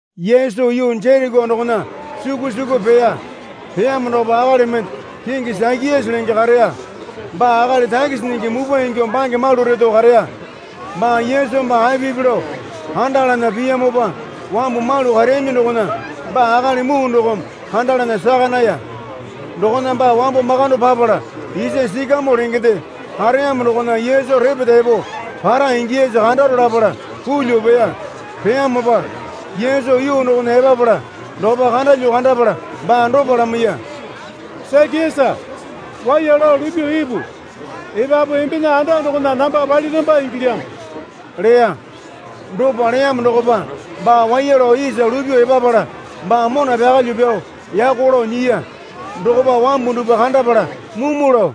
Yesu yuu Jereko dokona suku suku peya. Peyamo dokopa akali mende kingi Sakiasa lenge kareya. Baa akali takisi nyingi mupwa ingyuo bange malu reto kareya. Baa Yesu baa apipi lao kandalana piyamopa wambu malu kareyaminyi dokona baa akali muu dokome kandalana saka naya. Dokona baa wambo makando papala isa sikamoo lengende kareyamo dokona Yesu repeta epo para ingiyasa kandaro lapala pulyuo peya. Peyamopa Yesu yuu dokona epapala dokopa kandalyuo kandapala baa dopa lamaiya. Sakiasa, waiya lao lupyuo ipu. Epapu embena anda dokona namba paliramba ingilyamo, leya. Dopa leyamo dokopa baa waiya lao isa lupyuo epapala baa mona pyakalyuo pyao yako lao nyiya. Dokopa wambu dupwa kandapala mumu lao,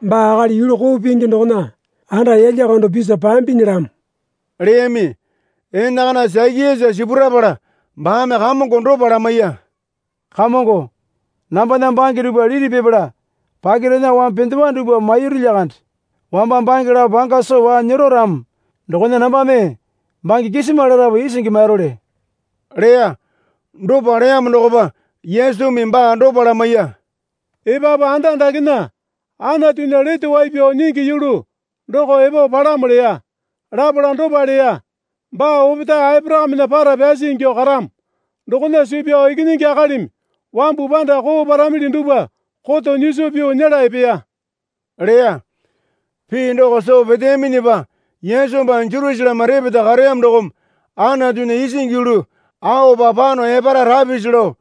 Baa akali yulu koo pingi dokona anda yalya kando pisa pambinyilamo, leyami. Enakana Sakiasa sipurapala baame Kamongo dopa lamaiya. Kamongo, nambana bange dupwa liti pipala pakirena wambu pendewa dupwa mairu lyakande. Wamba bange lapo panga soo waa nyero ramo dokona nambame bange kisima larapu isingi mairole, leya. Dopa leyamo dokopa Yesumi baa dopa lamaiya. Epapu anda dakena Anatunya lete wai pyao nyingi yulu doko epo palamo leya. Lapala dopa leya. Baa opetae Aporakamena para pyasi ingyuo karamo. Dokona suu pyao Ikinyingi Akalimi wambu panda koo paramili dupwa koto nyiso pyuo nyela epeya, leya. Pii doko soo peteyaminyipa Yesu baa Jerusaleme repeta kareyamo dokome Anatunya isingi yulu aopa pano epara rapisi lao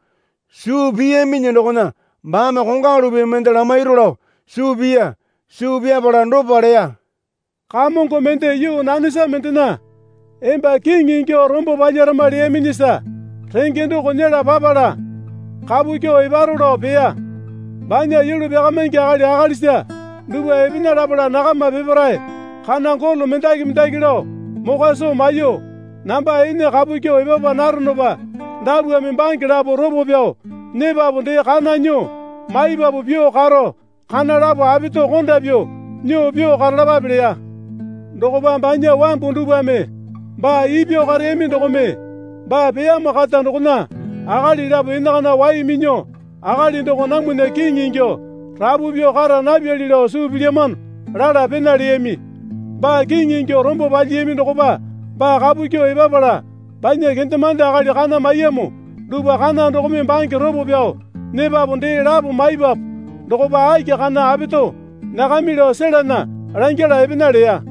suu piyaminyi dokona baame kongwalu pii mende lamairu lao suu piya. Suu pyapala dopa leya. Kamongo mende yuu nanesa mendena emba kiŋi ingyuo rombo palyarama leyaminyisa renge doko nyela papala kapu kyuo eparo lao peya. Banya yulu pyakamingi akali akalisa dupwa epena lapala nakama peparae kana golo mendaki mendaki lao mokwa soo maiyuo, Namba ene kapu kyuo epapa naronopa dapwame bange lapo ropo pyao nyepapu dee kana nyuo maipapu pyuo karo kana lapo apeto konda pyuo nyuo pyuo karalapape leya. Dokopa banya wambu dupwame baa ipyao kareyami dokome baa peyamo kata dokona akali lapo enakana wai minyuo akali doko namwana kiŋi ingyuo rapu pyuo kara napyali lao suu pilyamano lala pena leyami. Baa kiŋi ingyuo rombo palyiyami dokopa baa kapu kyuo epapala banya kendemande akali kana maiyamo dupwa kana dokome bange ropo pyao nyepapu dee lapo maipapu dokopa aki kana apeto nyakami lao selana langyala epena leya.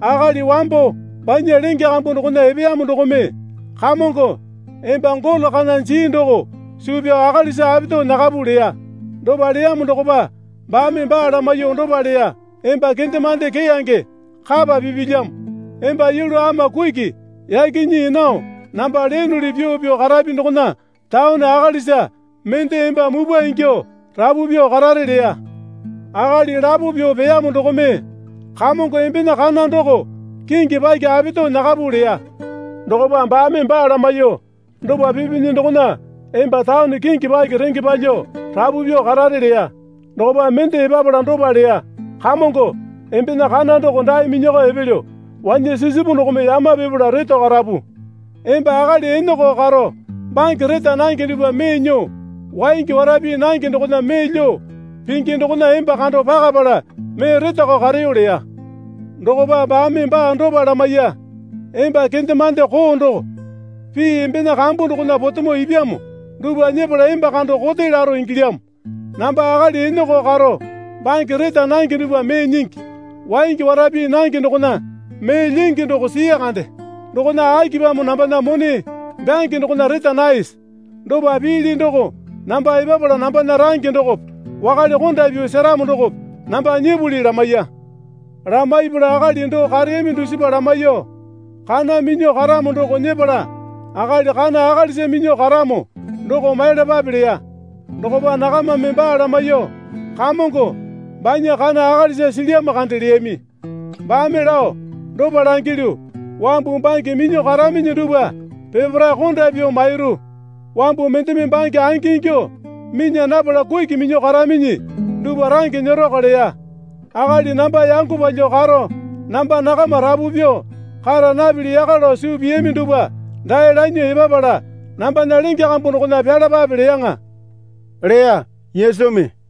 Akali wambo banya lenge kambu dokona epeyamo dokome, Kamongo, emba golo kana jii doko suu pyao akalisa apeto nyakapu, leya. Dopa leyamo dokopa baame baa lamaiyuo dopa leya. Emba kendemande keyange, kapa pipilyamo. Emba yulu ama kuki yaki nyii nao namba leyonuli pyuo pyuo karapi dokona taone akalisa mende emba mupwa ingyuo rapu pyuo karare leya. Akali lapo pyuo peyamo dokome, Kamongo embena kana doko kingi paki apeto nyakapu, leya. Dokopa baame baa lamaiyuo, Dopa pipinyi dokona emba taone kingi paki renge palyuo rapu pyuo karare leya. Dokopa mende epapala dopa leya. Kamongo, embena kana doko dae minyakao epelyo. Wanyasisipu dokome yama pipala reto karapu. Emba akali eneko karo bange reta nange dupwa mee nyuo, waingi wara pii nange dokona mee lyuo pingi dokona emba kando pakapala mee retakao kareyo leya. Dokopa baame baa dopa lamaiya. Emba kendemande koo doko. Pii embena kambu dokona potemo ipyamo dupwa nyepala emba kando kote laro ingilyamo. Namba akali eneko karo bange reta nange dupwa mee nyingi, waingi wara pii nange dokona mee lyingi doko sii kande. Dokona akipamo nambana mone byange dokona reta naese? Dopa piili doko namba epapala nambana range dokope wakale konda pyuo seramo dokope namba nyipuli, lamaiya. Lamaipala akali doo kareyami dusipa lamaiyuo, Kana minyuo karamo doko nyepala akali kana akalisa minyuo karamo doko maiyalapape leya. Dokopa nakamame baa lamaiyuo, Kamongo, banya kana akalisa silyamo kande leyami. Baame lao, Dopa langilyu, wambu bange minyuo karaminyi dupwa peparae konda pyuo mairu. Wambu mendeme bange angi ingyuo minya napala kuki minyuo karaminyi dupwa range nyeroko leya. Akali namba yango palyuo karo namba nakama rapu pyuo kara napili yaka lao suu piyami dupwa dae lanyuo epapala nambana lenge kambu dokona pyalapape leyaŋa, leya Yesumi.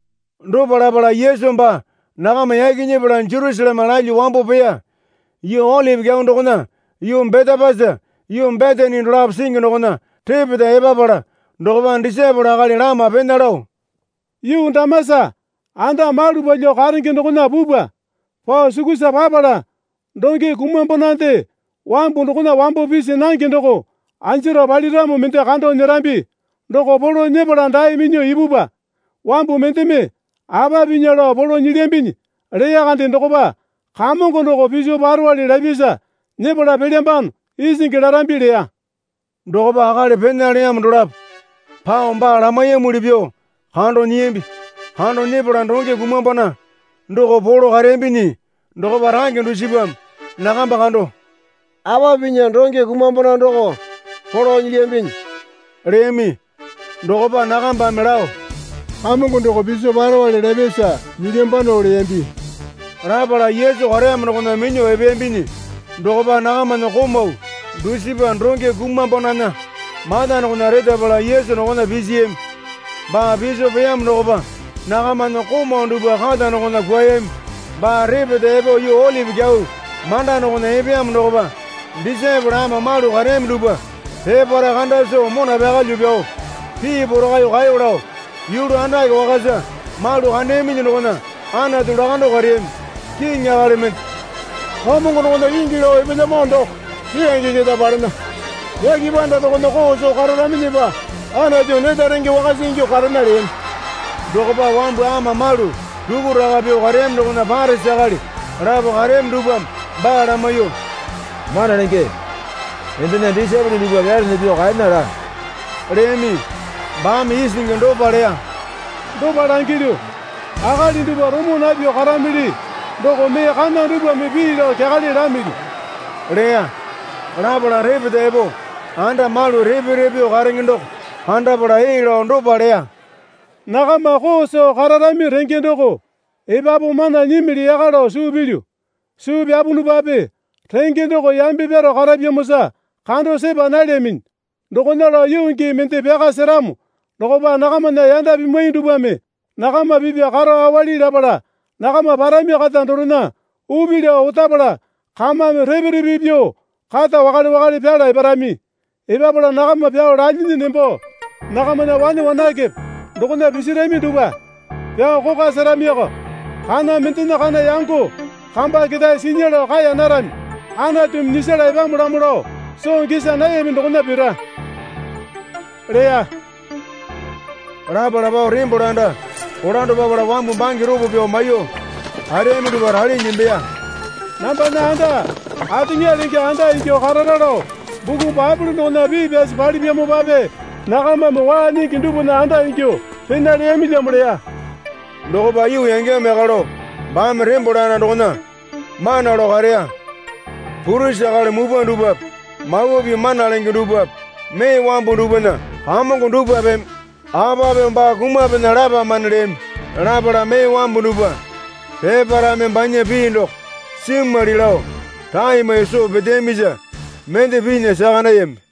Dopa lapala Yesu baa nakama yaki nyepala Jerusaleme lalyuo wambo peya. Yuu Olipi Kyau dokona yuu Betepasi yuu Betani dolapo singi dokona repeta epapala dokopa disaepole akali lama pena lao, Yuu damasa anda malu palyuo karenge dokona pupwa. Pao sukusa papala donge kumambonande wambu dokona wambo pisi nange doko anjaro paliramo mende kando nyerambi. Doko polo nyepala dae minyuo ipupwa. Wambu mendeme, Apa pinya lao polo nyilyambinyi, leya kande dokopa, Kamongo doko piso parowale lapyasa nyepala pelyambano, isingi larambi leya. Dokopa akali pena leyamo dolapo pao baa lamaiyamuli pyuo kando nyiyambi. Kando nyepala donge kumambona doko polo kareyambinyi dokopa range dusipame nakamba kando, Apa pinya donge kumambona doko polo nyilyambinyi? leyami. Dokopa nakambame lao, Kamongo doko piso parowale lapyasa nyilyambano leyambi. Lapala Yesu kareyamo dokona minyuo epeyambinyi dokopa nakamana komau dusipa donge kumambonana mata dokona retapala Yesu dokona pisiyami. Baa piso peyamo dokopa nakamana komau dupwa kata dokona kwuayami. Baa repeta epo yuu Olipi Kyau manda dokona epeyamo dokopa disaepole ama malu kareyami dupwa peparae kanda soo mona pyakalyuo pyao pii porakaiyuo kaeyo lao yulu andake wakasa malu kandeyaminyi dokona Anatu lakando kareyami. Kiŋi akali mende Kamongo dokona kingi lao epelyamo doko keyange keta palena. Yake panda dokona koo soo kararaminyipa Anatu neta renge wakasa ingyuo karena leyami. Dokopa wambu ama malu rukuraka pyuo kareyami dokona Parisi akali lapo kareyami dupwame baa lamaiyuo, Mana Lenge, embena disaepole dupwa pyalana pyuo kaena laa, leyami. Baame isingi dopa leya. Dopa langilyu, kalai dupwa romo napyuo karamili doko mee kana dupwame pii lao kyakale lamili, leya. Lapala repeta epo anda malu repe repe pyuo karenge doko kandapala ee lao dopa leya. Nakama koo soo kararami renge doko epapu mana nyimili yaka lao suu pilyu. Suu pyapunupape renge doko yambe pyaro karapyamosa kando sepa nalyaminyi. Dokona lao yuu gii mende pyaka seramo dokopa nakamana yanda pimwai dupwame nakama pipa karo awali lapala nakama parami kata dorena upi lao otapala kamame repe repe pyuo kata wakale wakale pyala eparami. Epapala nakama pyao lalyinyi nembo nakamana wane wanakepe dokona pisirami dupwa pyao kokwa seramioko. Kana mendena kana yango kamba ketae sinya lao kaeya narami. Anatumi nyisala epamolamo lao soo gisa nayami dokona pira, leya. Lapala pao tembole anda kolando papala wambu bange ropo pyao maiyuo kareyami dupwa ralinyi nembeya. Nambana anda ateŋa lenge anda ingyuo karara lao Buku Baepole dokona pii pyasi palipyamopape nakamame waa nyingi dupwana anda ingyuo pena leyamilyamo leya. Dokopa yuu yangeyamo yaka lao baame tembole anda dokona mana lao kareya. Purisi akali mupwa dupwape Mawa Pii mana lenge dupwape mee wambu dupwana kamongo dupwapeme, Apa pyuo baa kumapena lapamane leyami. Lapala mee wambu dupwa peparaeme banya pii doko simwali lao rae maiyuo soo peteyamisa mende pinya saka nayami.